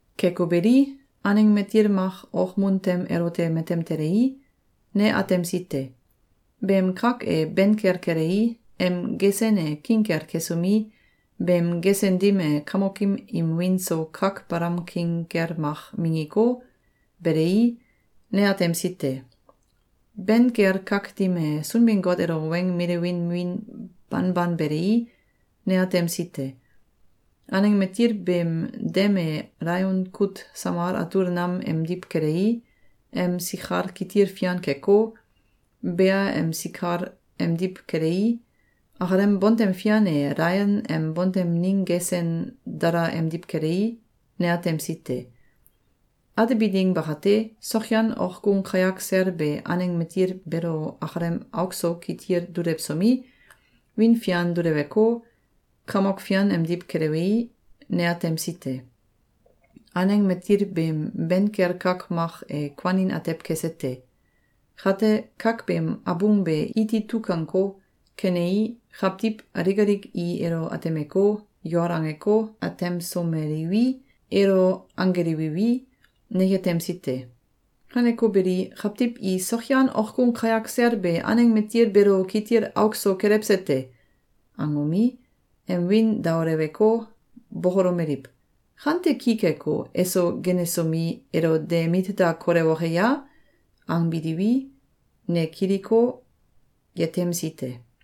Keko beli, aneng matil mak okmun tem elote matem telei, ne atemsi te. Beem kak e ben kel kelei, em gesen e king kel kesomi, beem gesen dim e kamokim im wiin so kak balam king kel mak minggiko, belei, ne atemsi te. Ben kel kak dim e Sunbin-Got elo weng milewin wiin banban belei, ne atemsi te. Aneng matil beem dem e alaion kut samal atul nam emdiw kelei, em sikal kitil fian keko, bea em sikal emdiw kelei, akalem bontem fian e alaion em bontem ning gesen dala emdiw kelei, ne atemsi te. Atebi ding bakate, sokyan okgung kayak sel be aneng matil beelo akalem auk so kitil dulewsomi, wiin fian duleweko, kamok fian emdiw kelewei, ne atemsi te. Aneng matil beem ben kel kak mak e kuanin atew kese te. Kate, kak beem abung be iti tukanko, kenei, kawtiw alik alik i elo atemeko, yol angeko, atemsomeliwi, elo anggelewiwi, ne yetemsi te. Kaneko beli, kawtiw i “Sokyan okgung kayak sel be aneng matil beelo kitil auk so kelewse te!”, angomi, em wiin daoleweko, bokolomeliw: “Kante ki keko, eso genesomi, elo de mit da kolewoke ya?”, angbiliwi, ne kiliko, yetemsi te.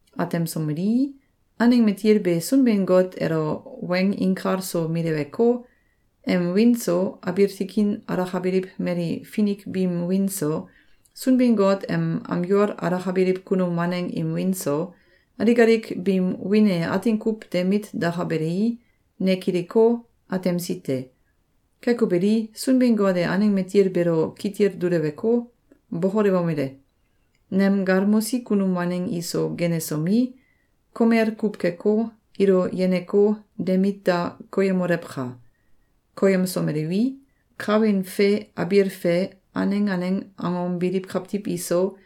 Atemsomelii, aneng matil be Sunbin-Got elo weng inkal so mileweko, em wiin so, abiil tikin alakabiliw mali finik biim wiin so, Sunbin-Got em am yol alakabiliw kunum waneng im wiin so, alik alik biim wiin e atin kuw de mit dakabelei, ne kiliko, atemsi te. Keko beli, Sunbin-Got e aneng matil beelo kitil duleweko, bokolewomele: “Nem galmosi kunum waneng iso genesomi, komel kuw keko, ilo yeneko, de mit da koyemolewka! Koyemsomelewi, kawin fe abiil fe aneng aneng angom biliw kawtiw iso,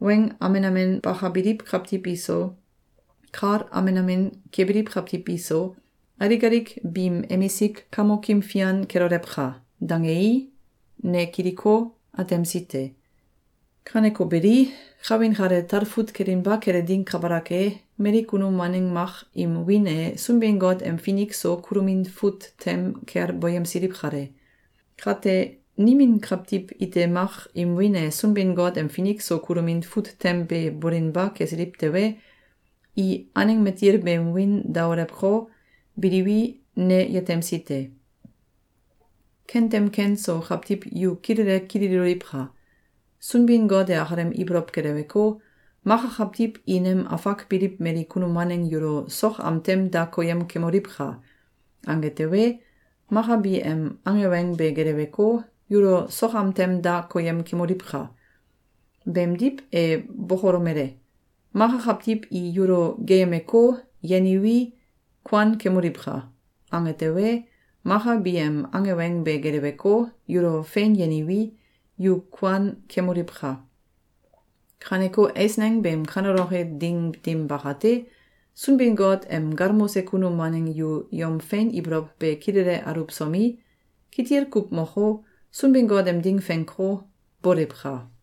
weng amen amen bakabiliw kawtiw iso, kal amen amen kebiliw kawtiw iso, alik alik biim emisik kamokim fian kelolewka!”, dangei, ne kiliko, atemsi te. Kaneko beli, kawin kale talfut kelinba kele ding kabalak e, mali kunum waneng mak im wiin e Sunbin-Got em finik so kulomin fut tem kel boyemsiliw kale. Kate nimin kawtiw ite mak im wiin e Sunbin-Got em finik so kulomin fut tem be bolinba kesiliw tewe, i aneng matil beem wiin daolewko, biliwi, ne yetemsi te. Kentem ken so kawtiw yu kilele kililoliwka! Sunbin-Got e akalem ibolow geleweko, “Maka kawtiw i nem afak biliw mali kunum waneng yulo sok am tem da koyem kemoliwka!”, ange tewe, maka bi em ange weng be geleweko, yulo sok am tem da koyem kemoliwka! Beemdiw, e bokolomele: “Maka kawtiw i yulo geeyemeko, yeniwi, kuan kemoliwka!”, ange tewe, maka bi em ange weng be geleweko, yulo fein yeniwi, yu kuan kemoliwka! Kaneko eisneng beem kaneloke ding dim bakate, Sunbin-Got em galmose kunum waneng yu yom fein ibolow be kilele aluwsomi, kitil kuw moko, Sunbin-Got em ding fenko, boliwka!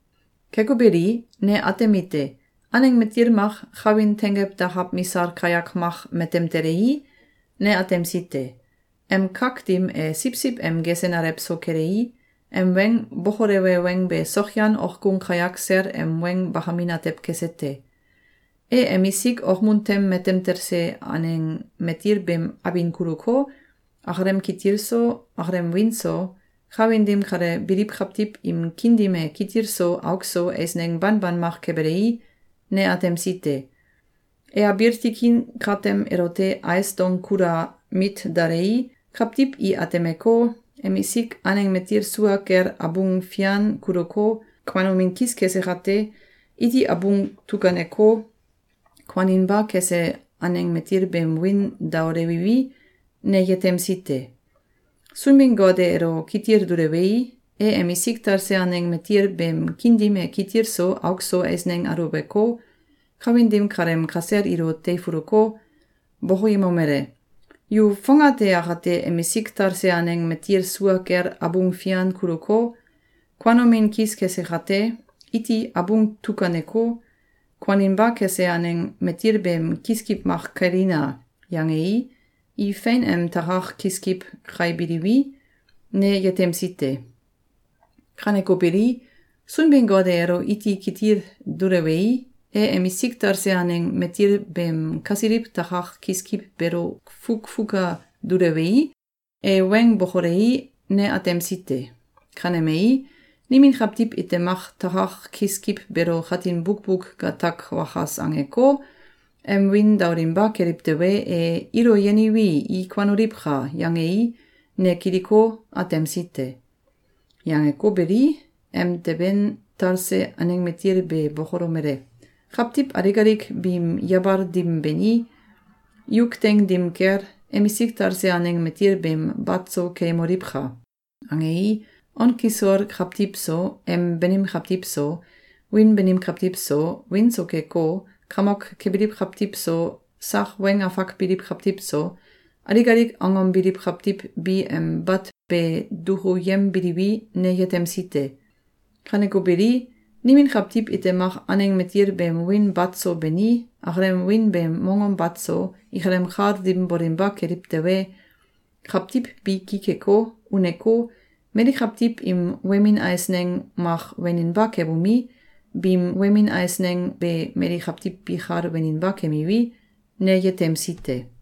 Keko beli, ne atemite: Aneng matil mak kawin tenggew dakaw misal kayak mak matem telei, ne atemsi te. Em kak dim e siwsiw em gesen alew so kelei, em weng bokolewe weng be sokyan okgung kayak sel em weng bakamin atew kese te. E emsik okmun tem matem talse aneng matil beem abin kuluko, akalem kitil so, akalem wiin so, kawin dim kale biliw kawtiw im kiin dim e kitil so auk so eisneng banban mak kebelei, ne atemsi te. E abiil tikin katem elote ais dong kula mit dalei, kawtiw i atemeko, emisik aneng matil sua kel abung fian kuluko, kuanomin kis kese kate, iti abung tukaneko, kuaninba kese aneng matil beem wiin daolewiwi, ne yetemsi te. Sunbin-Got e elo kitil dulewei, e emisik talse aneng matil beem kiin dim e kitil so auk so eisneng aluweko, kawin dim kaleem kasel ilo teifuluko, bokoyemomele: “Yu fongate akate emisik talse aneng matil sua kel abung fian kuluko, kuanomin kis kese kate, iti abung tukaneko, kuaninba kese aneng matil beem kiskiw mak kailina!”, yangei, i fein em takak kiskiw kaibiliwi, ne yetemsi te. Kaneko beli, Sunbin-Got e elo iti kitil dulewei, e emisik talse aneng matil beem kasiliw takak kiskiw beelo fukfuka dulewei, e weng bokolei, ne atemsi te. Kanemei, nimin kawtiw ite mak takak kiskiw beelo katin bukbuk gatak wakas angeko, em wiin daolinba keliw tewe, e “Ilo yeniwi, i kuanoliwka!”, yangei, ne kiliko, atemsi te. Yangeko beli, emteben talse aneng matil be bokolomele: “Kawtiw alik alik biim yabal dim beni, yuk teing dim kel, emisik talse aneng matil beem bat so keyemoliwka!”, angei, on kisol kawtiw so, em banim kawtiw so, wiin banim kawtiw so, wiin so keko, kamok kebiliw kawtiw so, sak weng afak biliw kawtiw so, alik alik angom biliw kawtiw bi em bat be dukuyembiliwi, ne yetemsi te. Kaneko beli, nimin kawtiw ite mak aneng matil beem wiin bat so beni, akalem wiin beem mongom bat so, ikalem kal dim bolinba keliw tewe, kawtiw bi ki keko, uneko, mali kawtiw im wemin eisneng mak weninba kebomi, biim wemin eisneng be mali kawtiw bikal weninba kemiwi, ne yetemsi te.